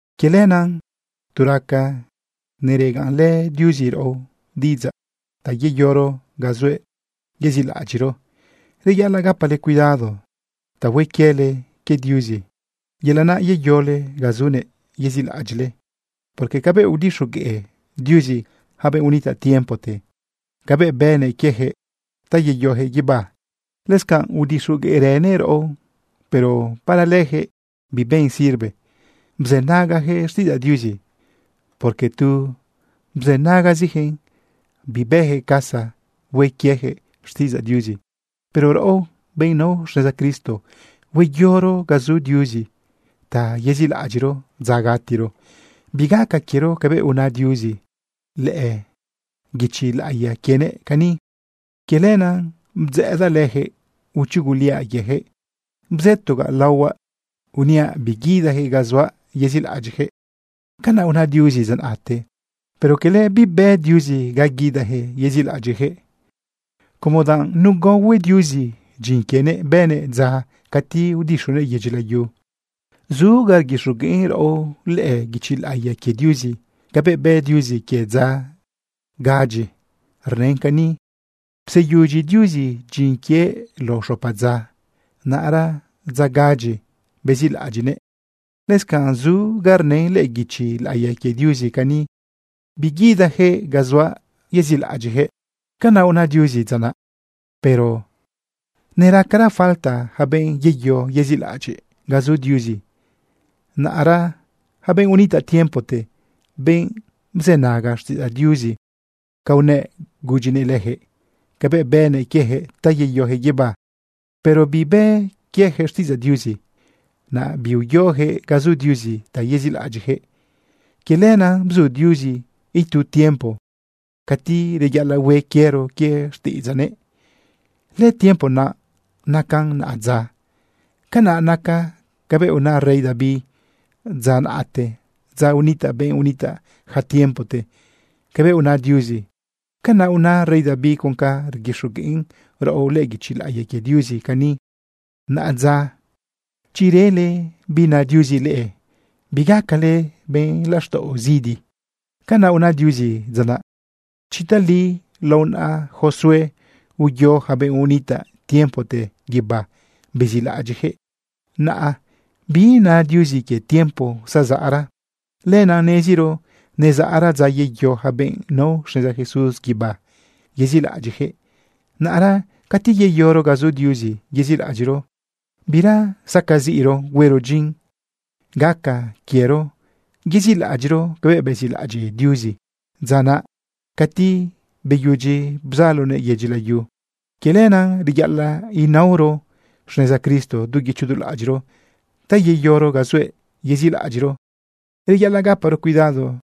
Quie lenaꞌ tu raca neregaꞌnlë Diuzi raꞌo diꞌidzaꞌ ta yeyoro ga zuëꞌ yezilaꞌadyiꞌro, reyaꞌalaꞌ gapale cuidado ta hue quiele quie Diuzi, yelaꞌ naꞌ yeyole ga zunëꞌ yezilaꞌadyiꞌle. Porque cabëꞌ udixoguëꞌ Diuzi yaca benꞌ unitaꞌ tiempote cabëꞌ bënëꞌ quiejëꞌ ta yeyojëꞌ guibá, lëscanꞌ udixogueꞌrënëꞌ raꞌo. Pero para lëjëꞌ biben sirve bzënagajëꞌ xtiꞌidzaꞌ Diuzi, porque tu bzënagazijëꞌn bibëjëꞌ casa hue quiejëꞌ xtiꞌidzaꞌ Diuzi. Pero raꞌo, benꞌ nao xneza Cristo, hueyoro ga zu Diuzi ta yezilaꞌadyiꞌro dza gatiro. Bigaca quiero cabëꞌ una Diuzi lëꞌë guichi laꞌiya quienëꞌ cani: Quie lenaꞌ bdzëꞌëdaꞌ lëjëꞌ, uchuguliaꞌ quiejëꞌ bzëtogaꞌ laohuaꞌ uniaꞌ biguidajëꞌ ga zuaꞌ yezilaꞌadyiꞌjëꞌ. Canaꞌ una Diuzi dza naꞌte. Pero cala bibë Diuzi ga guidajëꞌ yezilaꞌadyiꞌjëꞌ, como danꞌ nugaohue Diuzi dyin quienëꞌ bënëꞌ dza cati udixunëꞌ yedyi layu. Zu ga rguixogueꞌn raꞌo lëꞌë guichi laꞌiya quie Diuzi cabëꞌ bë Diuzi quie dza gadyi. Rnën cani: Pseyudyi Diuzi dyin quienëꞌ lao xopa dza. Naꞌra dza gadyi bezilaꞌadyiꞌnëꞌ. Lëscanꞌ zu ga rnën lëꞌë guichi laꞌiya quie Diuzi cani: Biguidajëꞌ ga zuaꞌ yezilaꞌadyiꞌjëꞌ. Canaꞌ una Diuzi dza naꞌ. Pero neracara falta yaca benꞌ yeyo yezilaꞌadyiꞌ ga zu Diuzi. Naꞌra yaca benꞌ unitaꞌ tiempote, benꞌ bzënaga xtiꞌidzaꞌ Diuzi ca unëꞌ gudyinëꞌ lëjëꞌ cabëꞌ bënëꞌ quiejëꞌ ta yeyojëꞌ guibá, pero bibë quiejëꞌxtiꞌidzaꞌ Diuzi, naꞌ biuyojëꞌ ga zu Diuzi ta yezilaꞌadyiꞌjëꞌ. Quie lenaꞌ bzu Diuzi itu tiempo cati reyaꞌalaꞌ hue quiero quie xtiꞌidzaꞌnëꞌ. Lëtiempo naꞌ nacan naꞌadza. Canaꞌ nacan cabëꞌ una rey David dza naꞌte, dza unitaꞌ benꞌ unitaꞌ ja tiempote. Cabëꞌ una Diuzi, canaꞌ una rey David con ca rguixogueꞌn raꞌo lëꞌë guichi laꞌiya quie Diuzi cani: Naꞌadza, chi rele bi na Diuzi leꞌe, bigacale benꞌ laxtaꞌo zidi. Canaꞌ una Diuzi dza naꞌ. Chi tali lao naꞌa Josué uyo yaca benꞌ unitaꞌ tiempote guibá bezilaꞌadyiꞌjëꞌ, naꞌ biina Diuzi quie tiempo zazaꞌra. Lenaꞌ neziro nezaꞌra dza yeyo yaca benꞌ nao xneza Jesús guibá yezilaꞌadyiꞌjëꞌ. Naꞌra cati yeyoro ga zu Diuzi yezilaꞌadyiꞌro, bira sacaziꞌro huero dyin. Gaca quiero yezilaꞌadyiꞌro cabëꞌ bezilaꞌadyiꞌ Diuzi dza naꞌ cati beyudyi bzalonëꞌ yedyi layu. Quie lenaꞌ reyaꞌalaꞌ inaoro xneza Cristo du guicho du laꞌadyiꞌro ta yeyoro ga zuëꞌ yezilaꞌadyiꞌro. Reyaꞌalaꞌ gaparo cuidado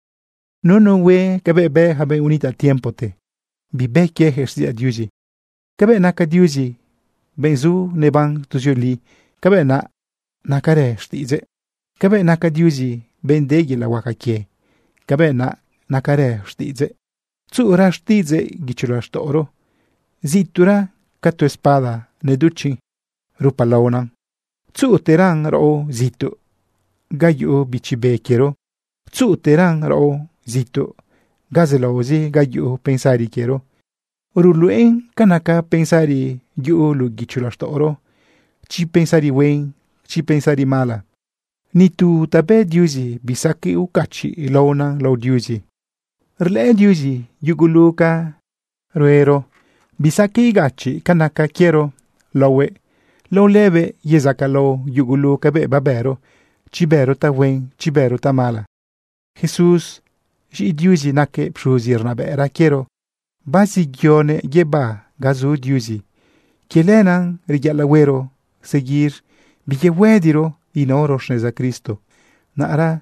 nu nu hue cabëꞌ bë ja benꞌ unitaꞌ tiempote, bibë quieyaquëꞌ xtiꞌidzaꞌ Diuzi. Cabëꞌ naca Diuzi benꞌ zu neban tuzioli, cabëꞌ naꞌ nacarë xtiꞌidzëꞌ. Cabëꞌ naca Diuzi benꞌ de yelaꞌ huaca quie, cabëꞌ naꞌ nacarë xtiꞌidzëꞌ. Tzuꞌura xtiꞌidzëꞌ guicho laxtaꞌoro zituꞌra ca tu espada neduchiꞌn rupalaona. Tzuꞌuteran raꞌo zituꞌ ga yuꞌu bichi be quiero. Tzuꞌuteran raꞌo zituꞌ ga zelaozi ga yuꞌu pensari quiero. Ruluꞌen ca naca pensari yuꞌu luꞌu guicho laxtaꞌoro, chi pensari huen, chi pensari mala. Ni tu ta bë Diuzi bisaqueꞌ ucachiꞌlaona lao Diuzi. Rlëꞌë Diuzi yugulu ca ruero. Bisaqueꞌ igachiꞌ ca naca quiero laohuëꞌ. Lao lëbëꞌ yezacalao yugulu cabëꞌ babëro, chi bëro tahuen, chi bëro tamala. Jesús, z̃iꞌi Diuzi, naquëꞌ pxuzi rnabëꞌra quiero, baziyoguëꞌ guibá ga zu Diuzi. Quie lenaꞌ reyaꞌalaꞌ huero seguir biyehuëdiro inaoro xneza Cristo. Naꞌra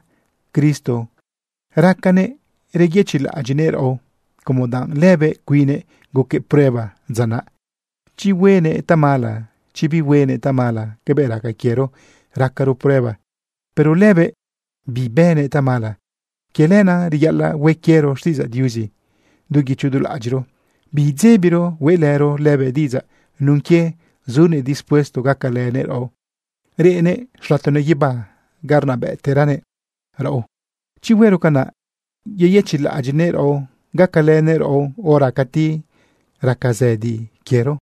Cristo racanëꞌ reyëchiꞌlaꞌadyiꞌnëꞌ raꞌo como danꞌ lëbëꞌ cuinnëꞌ guquëꞌ prueba dza naꞌ, chi huenëꞌ tamala, chi bihuenëꞌ tamala, cabëꞌ raca quiero racaro prueba, pero lëbëꞌ bibënëꞌ tamala. Quie lenaꞌ reyaꞌalaꞌ hue quiero xtiꞌidzaꞌ Diuzi du guicho du laꞌadyiꞌro, biidzebiro hueꞌlëro lëbëꞌ diꞌidzaꞌ nun quie zunëꞌ dispuesto gacalënëꞌ raꞌo, reꞌnëꞌ xlatonëꞌ guibá ga rnabëꞌteranëꞌ raꞌo. Chi huero canaꞌ, yeyëchiꞌlaꞌadyiꞌnëꞌ raꞌo gacalënëꞌ raꞌo hora cati raca zëdi quiero.